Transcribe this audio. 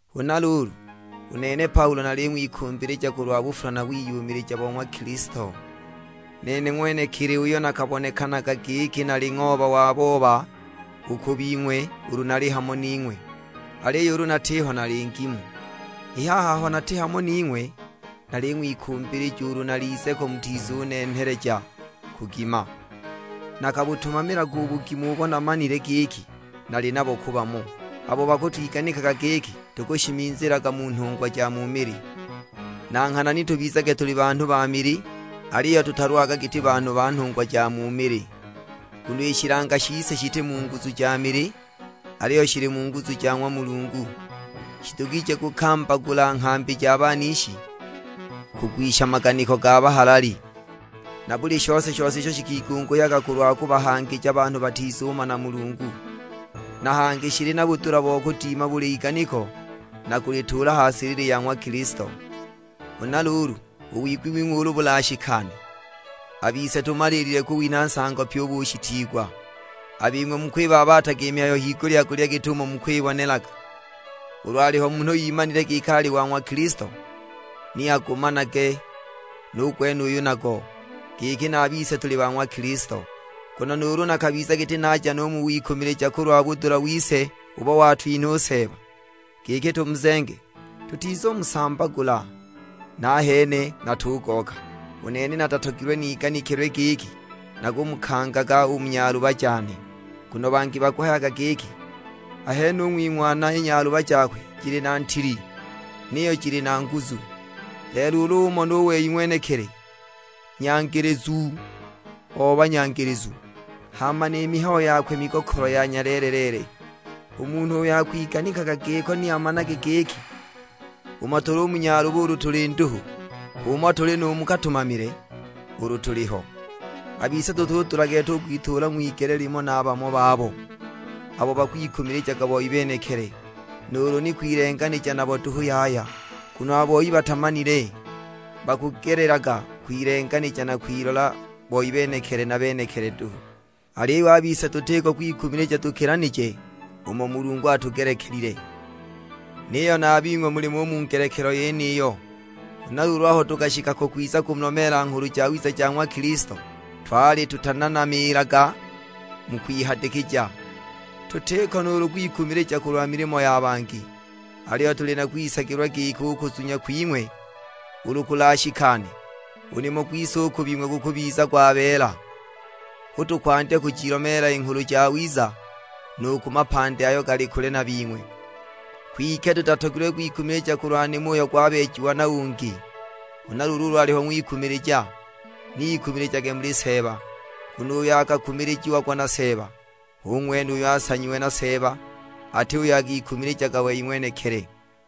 Huna luulu, u nene Paulo naling'wikumbilija kulwa bufula na wiyumilija bo ng'wa Kilisto; nene ng'wenekili uyo nakabonekanaga giki nali ng'ooba wa booba u ku bing'we ulu nali hamo ning'we, aliyo ulu natiho nali ngimu! I haha aho nati hamo ning'we, naling'wikumbilija ulu nalize ko mutizunenheleja kugima, nakabutumamila u bugimu ubo namanile giki nali nabo ku bamo, abo bakutwiganikilaga giki tukushimizilaga mu nhungwa ja mu mili. Na nghana ni tubizage tuli banhu ba mili, aliyo tutalwaga giti banhu ba nhungwa ja mu mili. Nguno i shilanga shise shiti mu nguzu ja mili, aliyo shili mu nguzu ja ng'wa Mulungu. Shidugije kukambagula nghambi ja banishi, kugwisha maganiko ga bahalali; na buli shose-shose isho shikigunguhyaga kulwa kubahangija banhu batizumana Mulungu. Na hangi shili na budula bo kudima buli iganiko, na kulituula ha silili ya ng'wa Kilisto. Huna luulu, u wigwi wing'we ulu bulashikane, a bise tumaliilile kuwinha nsango pyi u bushitiigwa. A bing'we mukwibabataga i mihayo higulya-gulya git'umo mukwibonelaga; ulu aliho munhu imanile giki ali wa ng'wa Kilisto, ni agumanage nu gwenuyu nago, giki na a bise tuli ba ng'wa Kilisto. Nguno nuulu nakabiza giti naja no u mu wikumilija kulwa budula wise ubo watwinha Seeba, giki tumuzenge, tutizumusambagula, nahene natugooka. U nene natatogilwe niganikilwe giki nakumukangaga u mu nyaluba jane. Nguno bangi bakuhayaga giki, "Ahene u ng'wing'wana i nyaluba jakwe jili na ntili, niyo jili na nguzu; lelo ulu umona u wei ng'wenekili, nyangilizu o banyangilizu, hama ni mihayo yakwe migokolo ya nyaleele-leele!" U munhu uyo akwiganikaga giko ni amanage giki, umo tuli u mu nyaluba ulu tuli nduhu, h'umo tuli nu mu katumamile, ulu tuliho. A bise tutudula gete u kwituula ng'wigele limo na bamo babo, abo bakwikumilijaga boi benekili; nuulu ni kwilenganija nabo duhu yaya. Nguno a boi batamanile; bakugelelaga kwilenganija na kwilola boi benekili na benekili duhu. Aliyo a bise tutiko kwikumilija tukilanije umo Mulungu atugelekelile, niyo na a bing'we mulimo u mu ngelekelo yeniyo. Huna luulu aho tukashika ko kwiza kumulomeela Nghulu Jawiza ja ng'wa Kilisto, twali tutananamiilaga mu kwihadikija. Tutiko nuulu kwikumilija kulwa milimo ya bangi, aliyo tuli na kwisagilwa giki u kuzunya kwing'we ulu kulashikane, u nimo gwise u ku bing'we gukubiza gwabeela. Hu tukwandya kujilomeela i Nghulu Jawiza nu ku mapandi ayo gali kule na bing'we, kwike tutatogilwe kwikumilija kulwa nimo uyo gwabeejiwa na ungi. Huna luulu ulu aliho ng'wikumilija, ni ikumilijage muli Seeba. Nguno uyo akakumilijiagwa na Seeba hu ng'wene uyo asanyiwe na Seeba, ati uyo akikumilijaga wei ng'wenekili.